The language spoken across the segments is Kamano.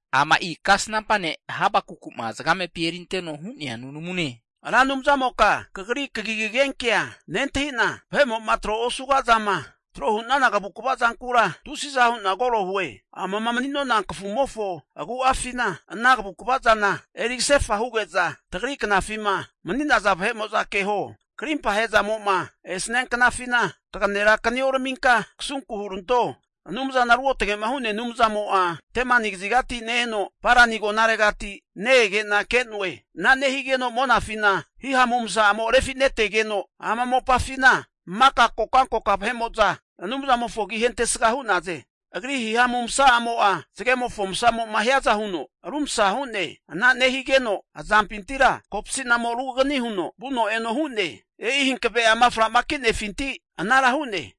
Ama'i kasnampa ne' Habakuku'ma zagamepi erinteno hu'nea nunamune. Ra Anumzamoka kagri kagi kagenkea nentahi'na, vahemo'ma tro osuga zama tro hu'nana kavukva zankura tusiza hu'na koro hue. Amama mani'nona kafumofo agu'afina ete ana kavukva zana eri kasefa huge'za, tagri knafima mani'naza vahe'mo'za keho. Krimpa ahe'zamo'ma esania knafina kaganera kanioraminka kasunku huranto. Anumzana ruotage'ma hu'nea Anumzamo'a Temani kazigati ne-eno, Parani agonaregati ne-ege'na ke'noe. Ana nehigeno monafina hihamu masa'amo refi'netegeno, ama mopafina maka kokankoka vahe'mo'za Anumzamofo agi ahentesga hu'naze. Agri hihamu masa'amo'a zagemofo masamo'ma hiaza huno rumsa hu'ne. Ana nehigeno azampintira kopsi'namo ruganini huno vuno eno hu'ne. E'i hankave'ama fra'ma ki'nefinti anara hu'ne.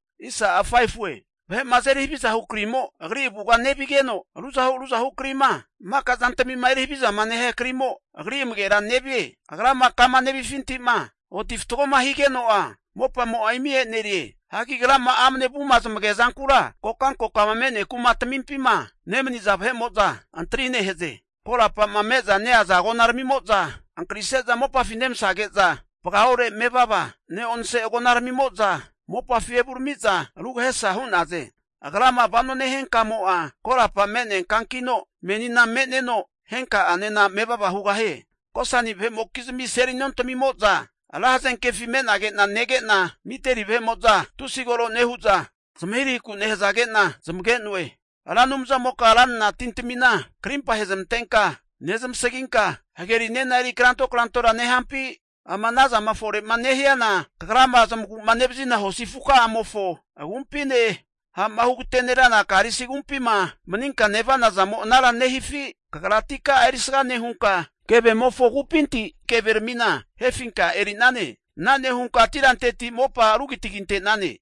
Vahe'ma azeri havizahu krimo Agri avuga nevigeno, ruzahu ruzahu krima maka zantamima eri havizama nehia kri'mo Agri amagera nevie. Agrama kama nevifinti'ma oti fatgoma higeno'a, mopamo'a imi e'nerie. Hagi Agrama amne avuma zamagea zankura kokankokama me'nea kuma tamimpima nemaniza vahe'mo'za antri nehaze. Korapa'ma me'za neaza agona ramimo'za ankarise'za mopafi nemasage'za, vagaore mevava ne'onse agonaramimo'za mopafi evurami'za rugahesa hu'naze. Agrama vano nehia kamo'a korapa me'nea kankino, menina me'neno, henka'anena mevava hugahie. Kusani vahe'mokizmi seli nontamimo'za ra hazenkefi me'nage'na nege'na, Midieni vahe'mo'za tusi koro nehu'za zamahirahiku nehazage'na zamage'noe. Ra Anumzamoka ranra tintamina karimpa ahezamantenka nezamasaginka, hagerinena eri kranto krantora nehampi? Ama anazama fore'ma nehiana, Kagrama zamagu'ma nevazina hosi afu ka'amofo agumpine, ha'ma hugatenerana karisi agumpima maninka nevana zamo anara nehifi? Kagra atika'a erisga nehunka, kevemofo kupinti keveramina hefinka eri'nane. Ana nehunka tiranteti mopa rugitaginte'nane.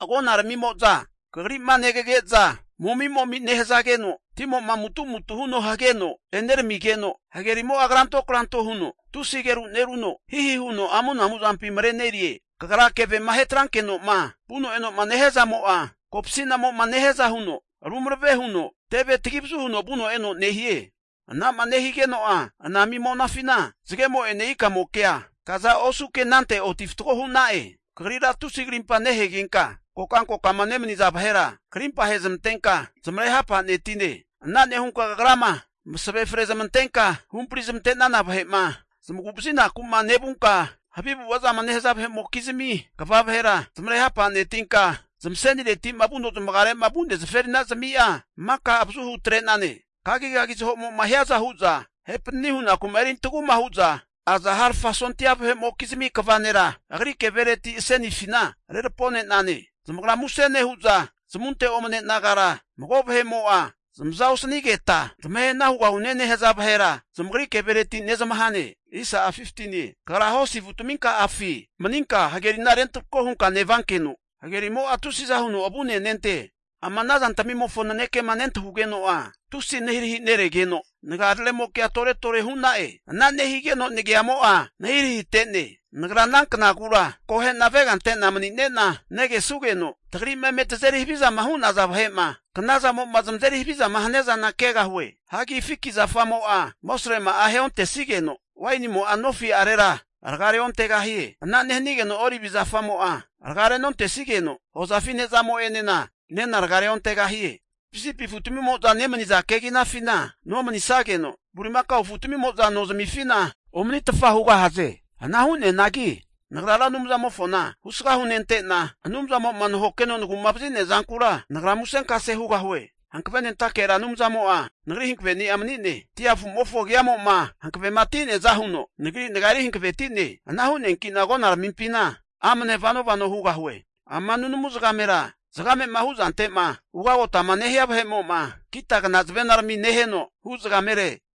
Agona ramimo'za Kagri'ma negage'za, momi'momi nehazageno, timo'ma amutu'mutu huno hageno eneramigeno, hagerimo'a kranto kranto huno tusi ageru neruno, hihi huno amunamu zampi marenerie. Kagra kevema ahe atranke'noma vuno eno'ma nehiazamo'a kopasi'namo'ma nehiaza huno rumarave huno teve tagi avazu huno vuno eno nehie. Ana'ma nehigeno'a anami monafina zagemo'ene ikamokea kaza osuke anante oti fatgo hu'na'e. Kagrira tusi karimpa nehegenka, kokankokama nemaniza vahera karimpa ahezamantenka zamare ha'panetine. Ana nehunka Kagrama masave fre zamantenka huhampari zamante'nana vahe'ma zamagu vazinaku'ma nevunka, havi avu'ava zama nehaza vahe'mokizmi kva vahera zamare hapa'netinka, zamasenireti'ma vuno zamagare'ma vu'nea zaferinazamia maka avazuhu atre'nane. Kagigagi zahomo'ma hiaza hu'za tahe panani hunaku'ma erintaguma hu'za aza harfa sondia vahe'mokizmi kva nera, agri kevereti asenifina rerapone'nane. Zamagra muse nehu'za zamunte omane nagara mago vahe'mo'a zamaza osanigeta zamahe hana hugahune nehaza vahera zamagri kevereti nezmahane. Kagra hosi afutaminka'afi mani'nenka hagerina rentarako hunka nevankeno, hagerimo'a tusiza huno avune nente. Ama ana zantamimofo nanekema nentahugeno'a tusi nahirahi neregeno, nagararemokea tore tore hu'na'e. Ana nehigeno nagiamo'a nahirahi te'ne. Nagra ana knagura akohe'na avega ante'na mani'nena negesugeno, tagri'ma eme tazeri havizama hu'naza vahe'ma knazamo'ma zamazeri havizama hania zana kegahue. Hagi fiki zafamo'a amosrema'a aheontesigeno, wainimo'a nofi'arera raga'a reontegahie. Ana nehanigeno olivi zafamo'a raga renontesigeno, hozafi ne'zamo'enena nena raga reontegahie. Sipisipi afutamimo'za nemaniza keginafina nomanisageno, bulimakao afutamimo'za nozmifina omanitfa hugahaze. Ana hugahianagi nagra Ra Anumzamofona husga hunente'na Anumzamo'ma nahokeno nagu'ma vazi'nea zankura nagra musenkase hugahue. Hankavenentake Ra Anumzamo'a nagri hankaveni'a mani'ne. Dia afu'mofo agiamo'ma hankavema ti'neaza huno nagri nagia eri hankavenetie. Ana hu'neanki'na agona ramimpina amne vano vano hugahue. Ama nunamu zagamera, zamamema huzante'ma ugotenoma nehia vahe'mo'ma kitagna zavenarami neheno hu' zagamere.